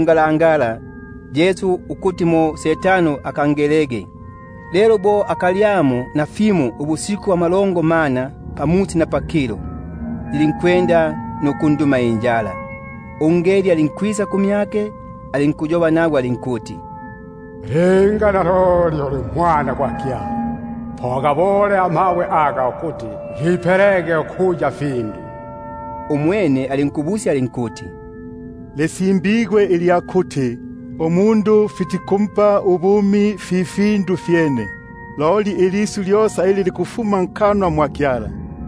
ngalangala, ukuti ageligwege numohesi. Bo afipikile ifindu amasiku amalongo mana pamusi na pakilo, yilinkunduma injala. Popapo ungeli alinkwisa kumyake alinkuyoba nagwe alinkuti: Linga uli Mwana gwa Kyala, po ugabulege amabwe aga ukuti gipelege findu. Umwene alinkwamula alinkuti: Lisimbigwe ilya kuti: Umundu fitikumpa ubumi fi findu fyene, loli ilisyu lyosa ili likufuma nkanwa mwa Kyala.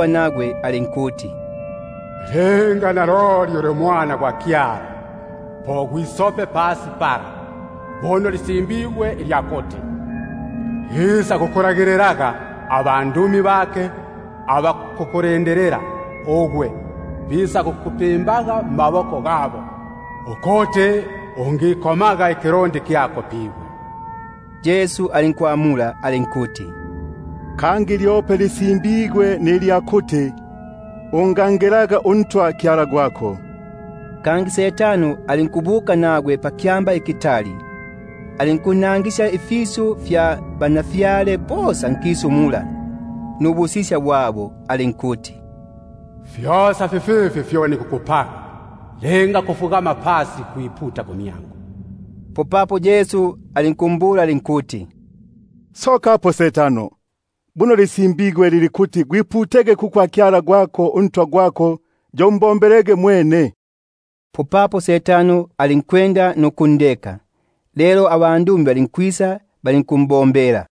alinkumbula alinkuti: Linga uli Mwana gwa Kyala, gwitagege pasi; buno lisimbigwe ilya kuti: Isakukulagililaga abandumi bake, bo bisakukupimbaga mmaboko gabo, ukuti ungisakwi- koma ikilundi kyako pibwe. Umwene Yesu alinkuyoba nagwe alinkuti: Kangi lisimbigwe ilya kuti: Ungangelaga uNtwa Kyala gwako. Kangi umohesi alinkubuka nagwe pakyamba ikitali fiyo, alinkunnangisya ubutwa bosa bwa nkisu nubuku- lumba bwake; alinkumbula alinkuti: Fyosa fififi nikukupaga, linga kubunguluka kumyangu. Popapo Yesu alinkumbula alinkuti: Sokapo gwe Setano! Buno lisimbigwe ilya kuti: Umbungulukilege uNtwa Kyala gwako, yo umbombelege yuyo mwene. Popapo umohesi alinkundeka, abandumi balinkwisa, balinkumbombela.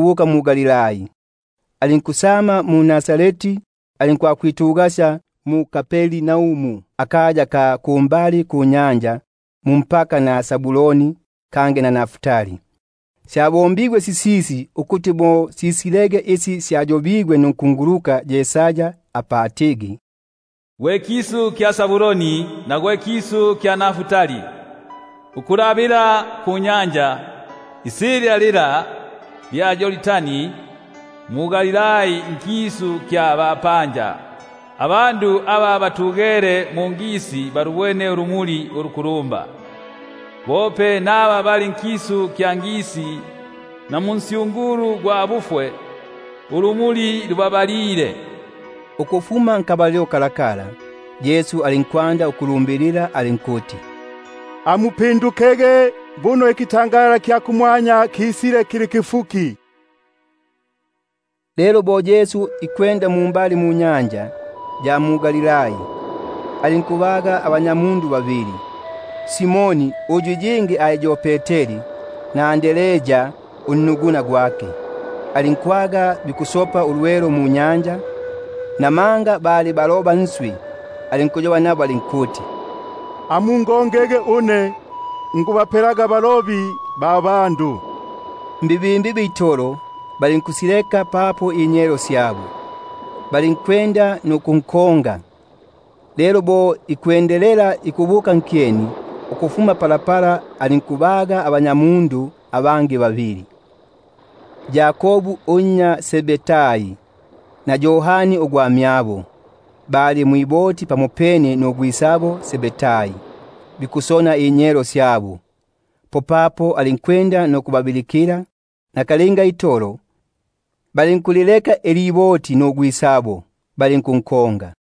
yongela mu-Galilai. Alinkusokamo mu-Nazareti, alinkubuka alinkwakwitugasya mu-Kapernaumu pambali panyanja, mmi- paka gya Zabuloni na Naftali; ukuti mo simalikilege sisyo syayobeligwe munkunguluka Yesaya, apa atigi: Ikisu kya Zabuloni nikisu kya Naftali, Ifi fipalamene ninyanja, isilya fila lya Yordani, Galilai ugwa bapanja, Abandu aba batugesye mungisi balubwene ulumuli ulukulumba; Na kuli aba batugele nkisu namunsyungulu gwa bufwe, ulumuli lubasokile. Ukufuma nkabalilo kalakala, Yesu alinkwanda ukulumbilila alinkuti: Amupindukege, buno ubutwa bwa kumwanya busegelile. Lelo bo ikwenda pambali panyanja ya Galihi, alinkubabona abanyamundu babili, Simoni uyu abilikiligwaga iya Peteri, na Andrea unnuguna, bikusopa ulwelo munyanja; namanga bali balobi. Alinkuyoba nabo alinkuti: Isaga mungongege, niku- bapelaga ukuya balobi ba bandu. Abene balinkusileka naka- linga inyelo syabo, balinkunkonga. Lelo bo akindilepo ukufuma pala, alinkubabona abanyamundu abangi babili, Yakobu unnya Zebedai na Yohani unnuguna bali mwiboti, pamopene na Zebedai ugwisabo, bo bikutendekesya inyelo syabo; alinkubabilikila. Popapo nakalinga balinkulileka iliboti nugwisabo, balinkunkonga.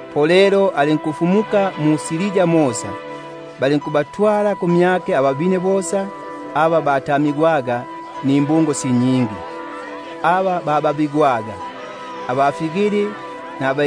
Bunobuno ukufumuka kwake kulinkwakufika mosa mu-Siria; balinkuntwalila ababine bosa, aba bakoligwe nimbungo sya luko nuluko aba batamigwaga, naba mbepo inyali, naba